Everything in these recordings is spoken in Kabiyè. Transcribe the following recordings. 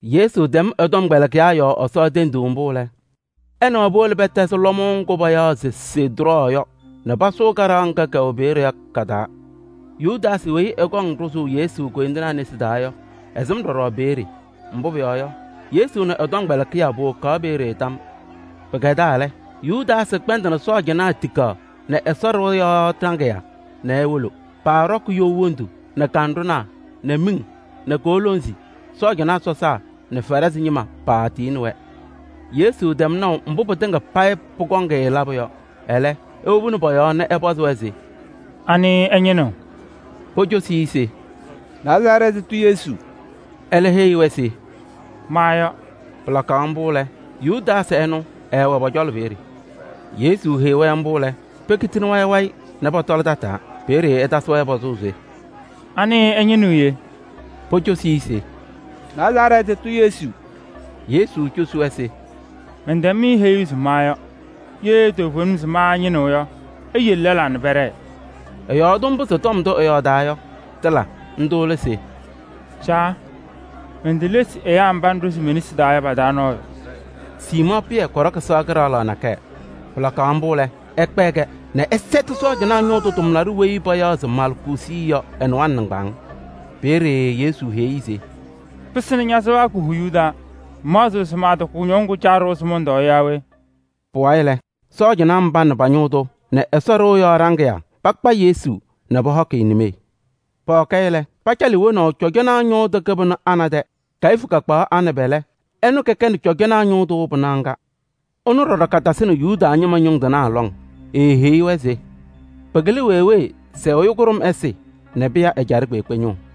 Yesu tɛm ɛ-tɔmkpɛlɩkɩyaa yɔɔ Ɛsɔ tenduu mbʋ lɛ, ɛ nɛ wɛ powolo pɛtɛzɩ lɔmʋʋ ŋgʋ payaɣ se Sedrɔɔ yɔ nɛ pasʋʋ kaɖaɣ ŋga kɛwɛ peeye yɔ ka-taa. Yudaasɩ weyi ɛkɔŋ ɖʋzʋʋ Yesu koyindinaa nesi taa yɔ, ɛsɩm ɖɔɖɔ peeye. Mbʋ pʋyɔɔ yɔ, Yesu nɛ ɛ-tɔmkpɛlɩkɩyaa powokaɣ peeye tam. Pɩkɛdaa lɛ, Yudaasɩ kpɛndɩnɩ sɔɔjanaa tikaɣ nɛ Ɛsɔ ɖɩɣa yɔɔ ɖaŋɩyaa nɛ ewolo. Paaɖɔkɩ you wondu nɛ kanɖʋnaa nɛ miŋ nɛ koolonzi. Cɔjɔnaa sɔsaa nɛ Farɩsɩ ñɩma paatiyini-wɛ. Yesu tɛm naʋ mbʋ pɩtɩŋa payɩ pʋkɔŋ-ɩ labʋ yɔ. Ɛlɛ, ewobini pɔ-yɔɔ nɛ ɛpɔzɩ-wɛ se: “Anɩ ɩñɩnɩɣ?” Pocosi-i se: “Nazarɛɛtɩ tʋ Yesu.” Ɛlɛ eheyi-wɛ se: “Ma yɔ.” Pɩlakaɣ mbʋ lɛ, Yudaasɩ ɛnʋ, ɛɛwɛ pɔ-cɔlɔ peeye. Yesu heyi-wɛ mbʋ lɛ, pekitini wayɩ wayɩ nɛ pɔtɔlɩ tataa. Peeye ɛtasɩ-wɛ pɔzʋʋ se: “Anɩ ɩñɩnɩɣ yee?” Pocosi se: “Nazarɛɛtɩ tʋ Yesu.” Yesu cosi-wɛ se: “Mɛntɛm-mɩ heyuu se ma yɔ. Ye toovenim se ma ɩñɩnɩɣ yɔ, iyele lɛlaa nɛ pɛɖɛɛ.” Ɛyɔɔdɩ mbʋ se tɔm ndʋ ɛɛyɔɔdaa yɔ, tɩla. Ndʋ lɛ se: “Caa, mentelesi ɛyaa mba ŋɖʋzɩ me-nesi taa yɔ pa-taa nɔɔyʋ.” Siimɔɔ Pɩyɛ kɔɖɔkɩ sɩɣa kɩɖaɣlaɣ nakɛyɛ. Pɩlakaɣ mbʋ lɛ, ɛkpɛɛ-kɛ nɛ ɛsɛtɩ cɔjɔnaa ñʋʋ tʋ tʋmlaɖʋ weyi payaɣ se Malcuusi yɔ ɛ-nɩwaŋ nɩŋgbaŋʋʋ. Peeye Yesu heyi-i se: “Pɩsɩnɩ ña-sɩɣa ko-huyuu taa. Ŋmaɣzɩɣ se mantaatɔɔ kʋñɔŋ ŋgʋ Caa ɖʋwa se mɔntɔɔ yɔ yaa we?” Pʋwayɩ lɛ, sɔɔjanaa mba nɛ pa-ñʋʋ tʋ nɛ Ɛsɔ ɖɩɣa yɔɔ ɖaŋɩyaa pakpa Yesu nɛ pɔhɔkɩ-ɩ nimee. Pɔhɔkɩ-ɩ lɛ, pacalɩ-ɩ wonaʋ cɔjɔnaa ñʋʋ tʋ kɩbɩnʋ Ana tɛ. Kayifu kakpaɣ Ana pɛlɛ, ɛnʋ kɛnɩ cɔjɔnaa ñʋʋ tʋ pɩnaɣ ŋga. Ɛnʋ ɖɔɖɔ katasɩnɩ Yuda ñɩma ñʋŋ tɩnaa lɔŋ. Eeheyi-wɛ se: “Pɩkɩlɩ wee wee se ɛyʋ kʋɖʋm ɛsɩ nɛ pɩya ɛjaɖɛ kpeekpe ñʋʋ.”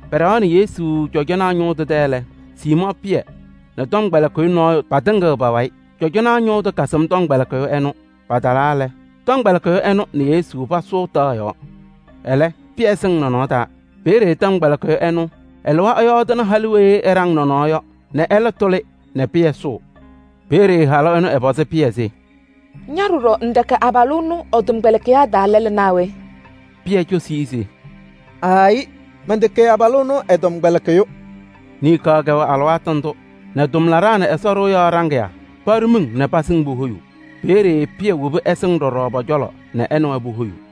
Pɛɖɛɣaɣnɩ Yesu cɔjɔnaa ñʋʋ tʋ tɛ lɛ, Siimɔɔ Pɩyɛ nɛ tɔmkpɛlɩkɩyʋ nɔɔyʋ patɩŋɩɣ pa-wayɩ. Cɔjɔnaa ñʋʋ tʋ kasɩm tɔmkpɛlɩkɩyʋ ɛnʋ. Patalaa lɛ, tɔmkpɛlɩkɩyʋ ɛnʋ nɛ Yesu pasʋʋ taɣ yɔɔ. Ɛlɛ, Pɩyɛ sɩŋ nɔnɔɔ taa. Peeye tɔmkpɛlɩkɩyʋ ɛnʋ ɛlɩwa ɛyɔɔdɩnɩ halʋ weyi ɛɖaŋ nɔnɔɔ yɔ nɛ ɛlɛ tʋlɩ nɛ Pɩyɛ sʋʋ. Peeye halʋ ɛnʋ ɛpɔzɩ Pɩyɛ se: “Ña ɖɔɖɔ ŋtɛkɛ abalʋ ɛnʋ ɛ-tɔmkpɛlɩkɩyaa taa lɛlʋ naa we?” Pɩyɛ cosi-i se: “Aayɩ, mɛntɛkɛ abalʋ ɛnʋ ɛ-tɔmkpɛlɩkɩyʋ.” Niŋkaɣ kɛwɛ alɩwaatʋ ndʋ nɛ tʋmlaɖaa nɛ Ɛsɔ ɖɩɣa yɔɔ ɖaŋɩyaa paɖʋ miŋ nɛ pasɩŋ pohoyuu. Peeye Pɩyɛ wobi ɛsɩŋ ɖɔɖɔ pɔ-cɔlɔ nɛ ɛ nɛ wɛ pohoyuu.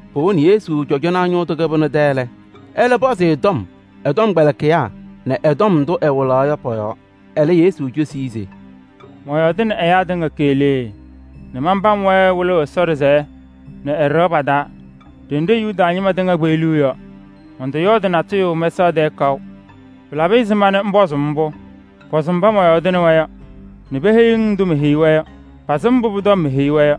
Powoni Yesu cɔjɔnaa ñʋʋ tʋ kɩbɩnʋ tɛ lɛ, ɛlɛ pɔzɩ-ɩ tɔm ɛ-tɔmkpɛlɩkɩyaa nɛ tɔm ndʋ ɛwɩlaɣ yɔ pɔ-yɔɔ. Ɛlɛ Yesu cosi-i se: “Mɔyɔɔdɩnɩ ɛyaa tɩŋa keɣlee nɛ manpam-wɛ wɩlʋʋ Ɛsɔ ɖɩsɛyɛ nɛ ɛ-ɖɩɣa pa-taa ɖenɖe Yuda ñɩma tɩŋa kpeɣliɣ yɔ. Mɔntɔyɔɔdɩ natʋyʋ mɛsaɣ tɛɛ kaʋ. Pɩlabɩ ɛzɩma nɛ ŋpɔzʋʋ-m mbʋ? Pɔzɩ mba mɔyɔɔdɩnɩ-wɛ yɔ nɛ peheyi-ŋ ndʋ meheyi-wɛ yɔ: pasɩm mbʋ pʋ-tɔm meheyi-wɛ yɔ.”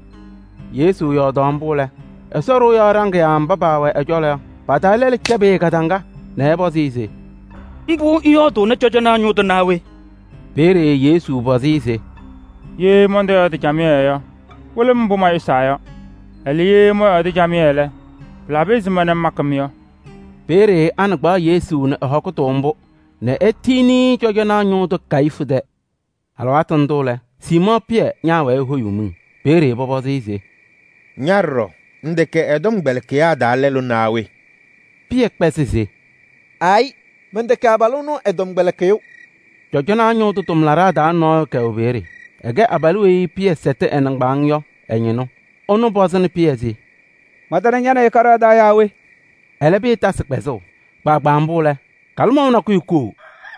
Yesu yɔɔdaɣ mbʋ lɛ, Ɛsɔ ɖɩɣa yɔɔ ɖaŋɩyaa mba paawɛ ɛ-cɔlɔ yɔ, pa-taa lɛlʋ cɛbɩ-ɩ kadaŋa nɛ ɛpɔzɩ-ɩ se: “Mbʋ ŋyɔɔdʋʋnɩ cɔjɔnaa ñʋʋ tʋ naa we?” Peeye Yesu pɔzɩ-ɩ se: “Ye mɔntɔyɔɔdɩ camɩyɛ yɔ, wɩlɩ-m mbʋ mayʋsɩnaa yɔ. Ɛlɛ, ye mɔyɔɔdɩ camɩyɛ lɛ, pɩlabɩ ɛzɩma ŋmakɩ-m yɔ?” Peeye Ana kpaɣ Yesu nɛ ɛ-hɔkʋtʋ mbʋ nɛ etiyini-i cɔjɔnaa ñʋʋ tʋ Kayifu tɛ. Alɩwaatʋ ndʋ lɛ, Siimɔɔ Pɩyɛ ñaawɛɛ ehoyuu miŋ. Peeye pɔpɔzɩ-ɩ se: “Ña ɖɔɖɔ, ŋtɛkɛ ɛ-tɔmkpɛlɩkɩyaa taa lɛlʋ naa we?” Pɩyɛ kpɛzɩ se: “Aayɩ, mɛntɛkɛ abalʋ ɛnʋ ɛ-tɔmkpɛlɩkɩyʋ.” Cɔjɔnaa ñʋʋ tʋ tʋmlaɖaa taa nɔɔyʋ kɛwɛ peeye. Ɛkɛ abalʋ weyi Pɩyɛ sɛtɩ ɛ-nɩŋgbaaŋ yɔ ɛ-ñɩnʋ. Ɛnʋ pɔzɩnɩ Pɩyɛ se: “Mantana ña nɛ ɩ kaɖaɣ taa yaa we?” Ɛlɛ Pɩyɛ tasɩ kpɛzʋʋ. Kpaagbaa mbʋ lɛ, kalɩmɔʋ nakʋyʋ koo.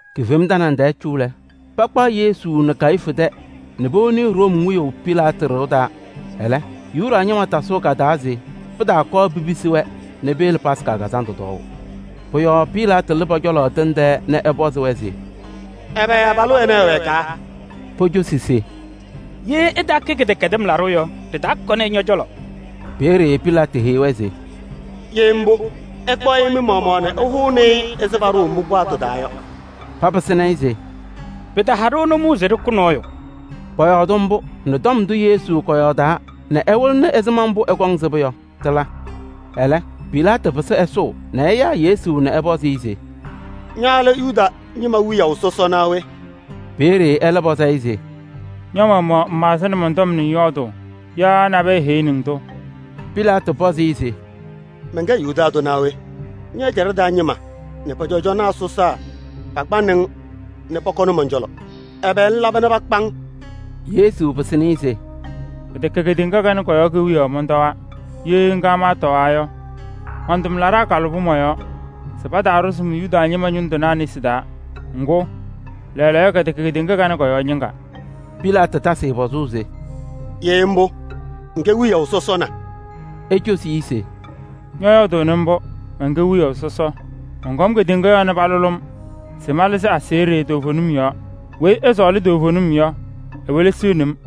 Kifema tanaŋ tɛɛ cu lɛ, pakpaɣ Yesu nɛ Kayifu tɛ nɛ powoni-i Room wiyaʋ Pilaatɩ ɖɩɣa taa. Ɛlɛ, Yuda ñɩma tasʋʋ ka-taa se pɩtaakɔɔ pipisi-wɛ nɛ peyele Yomiye Taa Lɩʋ Kazandʋ tɔɔʋ. Pʋ-yɔɔ Pilaatɩ lɩ pɔ-cɔlɔ tɩŋ tɛɛ nɛ ɛpɔzɩ-wɛ se: “Ɛbɛ abalʋ ɛnɛ ɛwɛkaa?” Pocosi-i se: “Ye ɛtaakɛ kɩdɛkɛdɩm laɖʋ yɔ, ɖɩtaakɔnɩ-ɩ ñɔ-cɔlɔ.” Peeye Pilaatɩ heyi-wɛ se: “Ye mbʋ, ɩkpaɣ-ɩ mɩ-maɣmaɣ nɛ ɩhʋnɩ-ɩ ɛzɩ paɖʋʋ mɩ-paɣtʋ taa yɔ.” Papɩsɩnɩ-ɩ se: “Pɩtaha-ɖʋ nʋmɔʋ se ɖɩkʋ nɔɔyʋ.” Pɔyɔɔdɩ mbʋ nɛ tɔm ndʋ Yesu kɔyɔɔdaa nɛ ɛwɩlɩnɩ ɛzɩma mbʋ ɛkɔŋ sɩbʋ yɔ, tɩla. Ɛlɛ, Pilaatɩ pɩsɩ ɛsʋʋ nɛ ɛyaa Yesu nɛ ɛpɔzɩ-ɩ se: “Ña lɛ Yuda ñɩma wiyaʋ sɔsɔ naa we?” Peeye ɛlɛ pɔzɩ-ɩ se: “Ña-maɣmaɣ ŋmaɣzɩnɩ mɔn-tɔm nɛ ŋyɔɔdʋʋ yaa nabɛyɛ heyini-ŋ-tʋ?” Pilaatɩ pɔzɩ-ɩ se: “Mɛnkɛ Yuda tʋ naa we? Ñɛ-ɛjaɖɛ taa ñɩma nɛ pɔ-cɔjɔnaa sɔsaa pakpanɩ-ŋ nɛ pɔkɔnɩ mɔn-cɔlɔ! Ɛbɛ ŋlaba nɛ pakpa-ŋ?” Yesu pɩsɩnɩ-ɩ se: “Pɩtɛkɛ kedeŋa kanɛ kɔ-yɔɔ kewiyaɣ mɔntɔwaa. Ye ŋga maatɔwaa yɔ, man-tʋmlaɖaa kalʋbɩ mɔ-yɔɔ se pataaɖʋzɩ-m Yuda ñɩma ñʋŋ tɩnaa nesi taa. Ŋgʋ, lɛɛlɛɛyɔ kɛtɛkɛ kedeŋa kanɛ kɔ-yɔɔ ñɩŋga.” Pilaatɩ tasɩ-ɩ pɔzʋʋ se: “Ye mbʋ, ŋkɛ wiyaʋ sɔsɔ na?” Ecosi-i se: “Ñɔyɔɔdʋʋnɩ mbʋ: mɛnkɛ wiyaʋ sɔsɔ. Mɔnkɔm kedeŋa yɔɔ nɛ palʋlɩ-m se malɩzɩ aseɣɖe toovenim yɔɔ. Weyi ɛsɔɔlɩ toovenim yɔ, ewelesiɣni-m.”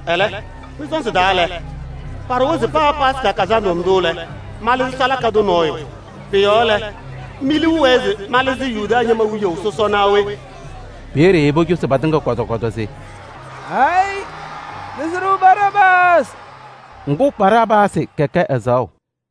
Ɛlɛ, mɩ-sɔɔnzɩ taa lɛ, paɖʋwa se paa Yomiye Taa Lɩʋ Kazandʋ ndʋ lɛ, malɩzɩ salaka tʋ nɔɔyʋ. Pʋ-yɔɔ lɛ, mi-liu wɛɛ se malɩzɩ Yuda ñɩma wiyaʋ sɔsɔ naa we?” Peeye pocosi patɩŋa kɔtɔ kɔtɔ se: “Aayɩ! Lɩzɩ-ɖʋ Baraabaasɩ.” Ŋgʋ, Baraabaasɩ kɛkɛ ɛzaɣʋ.